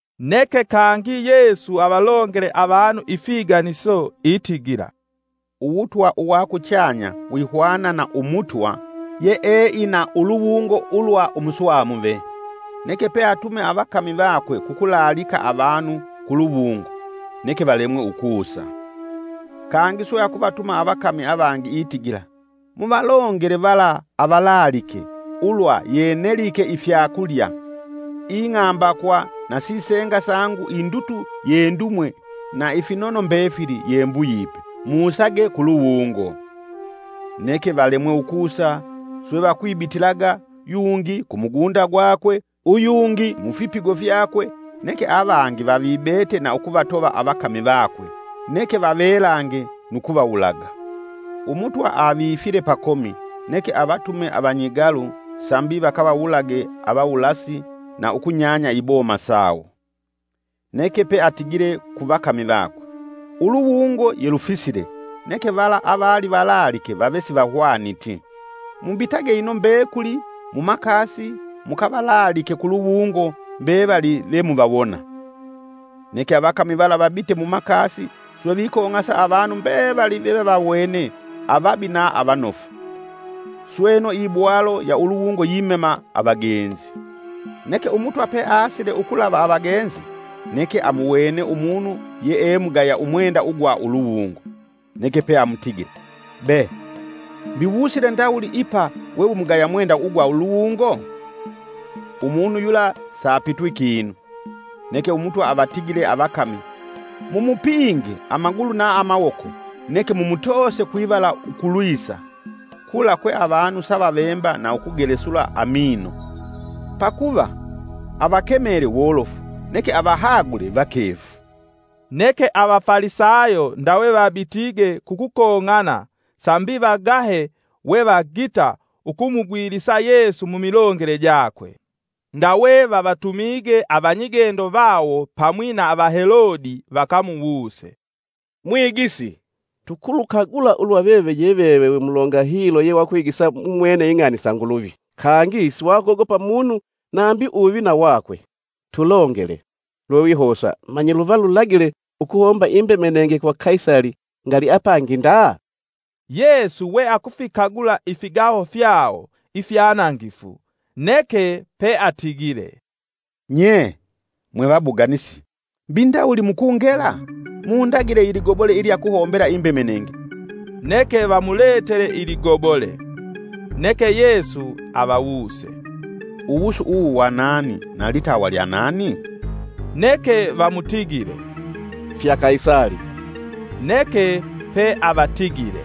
Neke kangi Yesu avalongele avanu ifiganiso itigila. “Uwutwa uwakuchanya wihwana na umutwa, yeeina uluwungo ulwa umuswamuve. Neke pe atume avakami vakwe kukulaalika avanu kuluwungo; neke valemwe ukusa. Kangi swe akuvatuma avakami avangi, itigila, ‘muvalongele vala avalaalike, ulwa ye nelike ifyakulya, ing'ambakwa na sisenga sangu indutu yendumwe na ifinono mbefili ye mbuyipe, musage kuluwungo!’ Neke valemwe ukusa, swe vakwibitilaga, yungi ku mugunda gwakwe, uyungi mufipigo fyakwe, neke avangi vavibete na ukuvatova avakami vakwe, neke vavelange, nu kuvawulaga. Umutwa avifile pakomi neke avatume avanyigalu sambi vakavawulage avawulasi na ukunyanya iboma sawo. Neke peatigile ku vakami vakwe, ‘Uluwungo yelufisile neke vala avali valaalike vave sivahwaniti. Mubitage ino mbekuli mumakasi mukavalaalike kuluwungo mbevali ve muvawona.’ Neke avakami vala vabite mumakasi swe vikong'asa avanu mbevali vevavawene avabi na avanofu, sweno ibwalo ya uluwungo yimema avagenzi. Neke umutwa peasile ukulava avagenzi, neke amuwene umunu yeemugaya umwenda ugwa uluwungo; Neke pe amutigile: ‘Be mbi wusile ndawuli ipa we wimugaya mwenda ugwa uluwungo?’ Umunu yula sapitwi kinu. Neke umutwa avatigile avakami: ‘Mumupinge amagulu na amawoko neke mumutoose kwivala ukulwisa; kula kwe avanu savavemba na ukugelesula amino.’” Pakuva, “Avakemele wolofu neke avahagule vakefu.” Neke Avafalisayo ndawe vabitige kukukong'ana sambi vagahe wevagita ukumugwilisa Yesu mumilongele jakwe. Ndawe vavatumige avanyigendo vawo pamwi na Avahelode vakamuwuse, “Mwigisi tukulukagula ulwa veve ye veve wemulonga hilo yewakwigisa mumwene ing'ani isa Nguluvi, kangi siwakogopa munu nambi uwuvina wakwe. Tulongele, lwewihosa, manyi luva lulagile ukuhomba imbemenenge kwa Kaisali ngali apangi nda?” Yesu we akufikagula ifigaho fyawo ifyanangifu, neke peatigile, “Nye! Mwevabuganisi mbi ndawuli mukungela? Mundagile iligobole ilya kuhombela imbemenenge neke vamuletele iligobole.” Neke Yesu avawuse, “Uwusu uwu wa nani na litawa lya nani?” Neke vamutigile, “Fya Kaisali.” Neke pe avatigile,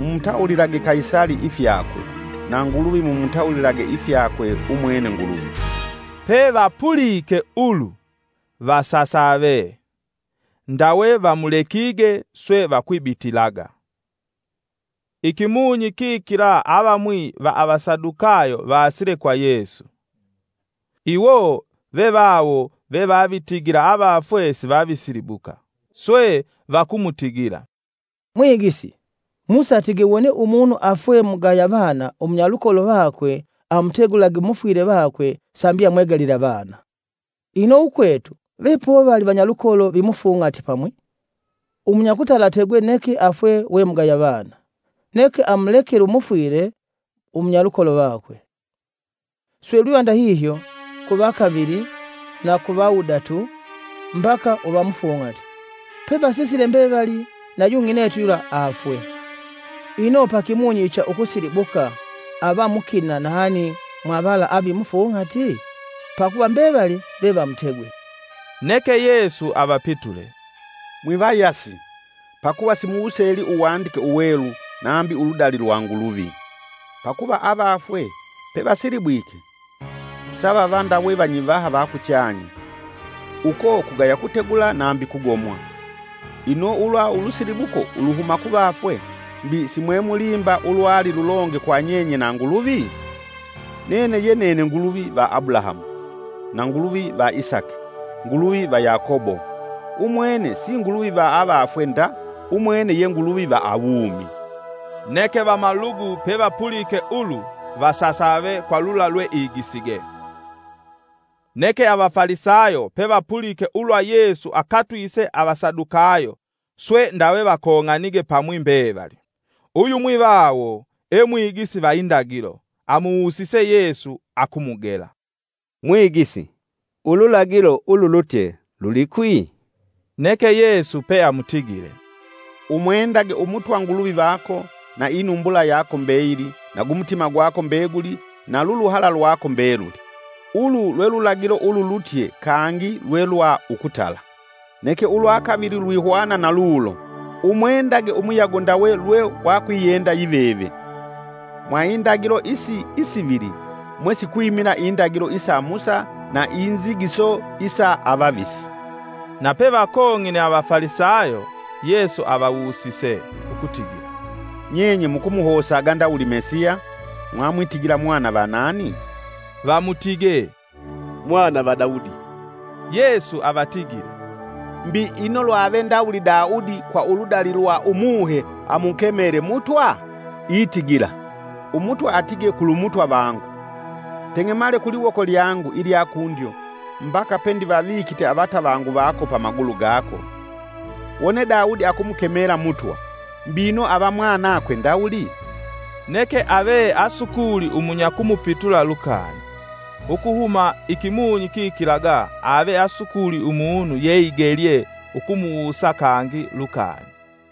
“Mumutawulilage Kaisali ifyakwe, na Nguluvi mumutawulilage ifyakwe umwene Nguluvi.” Pe vapulike ulu, vasasave; ndawe vamulekige swe vakwibitilaga. Ikimunyi kikila avamwi va avasadukayo vaasile kwa Yesu. Iwo vevawo vevavitigila avafwe sivavisilibuka. Swe vakumutigila, “Mwigisi, Musa atige wone umunu afwe mugaya vana umunyalukolo vakwe amutegulage umufwile vakwe sambi amwegalile avana. Ino ukwetu vepovali vanyalukolo vimufung'ati pamwi, umunyakutala ategwe neke afwe wemugaya vana neke amulekele umufwile umunyalukolo vakwe. Swe lwiva ndahihyo kuvakavili na kuvawudatu mbaka uvamufung'ati. Pevasisile mbevali na yung'inetu yula aafwe. Ino paikimunyi icha ukusilibuka ava mukina nani mwa vala avimufung'ati? Pakuva mbevali ve vamutegwe.” Neke Yesu avapitule, “Mwivayasi, pakuva simuwuseli uwandike uwelu nambi uludali lwa Nguluvi! Pakuva avafwe pevasilibwike, savava ndawe vanyivaha va kuchanya, uko kugaya kutegula nambi kugomwa. Ino ulwa ulusilibuko uluhuma kuvafwe, mbi si mwemulimba ulwali lulonge kwa nyenye na Nguluvi? ‘Nene ye nene Nguluvi va Abulahamu, na Nguluvi va Isaki, Nguluvi va Yakobo!’ Umwene si Nguluvi va avafwe nda, umwene ye Nguluvi va awumi.” Neke vamalugu pevapulike ulu, vasasave kwa lula lweigisige. Neke Avafalisayo pevapulike ulwa Yesu akatwise Avasadukayo, swe ndawe vakong'anige pamwi mbevali. Uyumwi vawo e mwigisi va indagilo, amuwusise Yesu akumugela. “Mwigisi, ululagilo ululutye lulikwi?” Neke Yesu peamutigile, “‘Umwendage umutwa Nguluvi vako na inumbula yako mbeyili na gumutima gwako mbeguli na luluhala lwako mbeluli.’ Ulu lwe lulagilo ululutye kangi lwelwa ukutala. Neke ulwa kavili lwihwana na lulo: ‘Umwendage umuyago ndawe lwe wakwiyenda yiveve!’ Mwa indagilo isi isivili mwe sikwimila indagilo isa Musa na inzigiso isa avavisi.” Na pevakong'ine Avafalisayo, Yesu avawusise ukutigila, “Nyenye mukumuhosaga ndawuli Mesiya? Mwamwitigila mwana va nani?” Vamutige, “Mwana va Daudi.” Yesu avatigile, “Mbi ino lwave ndawuli Daudi kwa uludali lwa umuhe amukemele Mutwa? Itigila, ‘Umutwa atige kulu Mutwa vangu, teng'emale kuliwoko lyangu ilya kundyo, mbaka pendivavikite avatavangu vako pamagulu gako.’ Wone Daudi akumukemela Mutwa, mbino ava mwanakwe ndawuli?” Neke ave asukuli umunya kumupitula lukani, ukuhuma ikimunyi kikilaga ave asukuli umunu yeigelye ukumuwusa kangi lukani.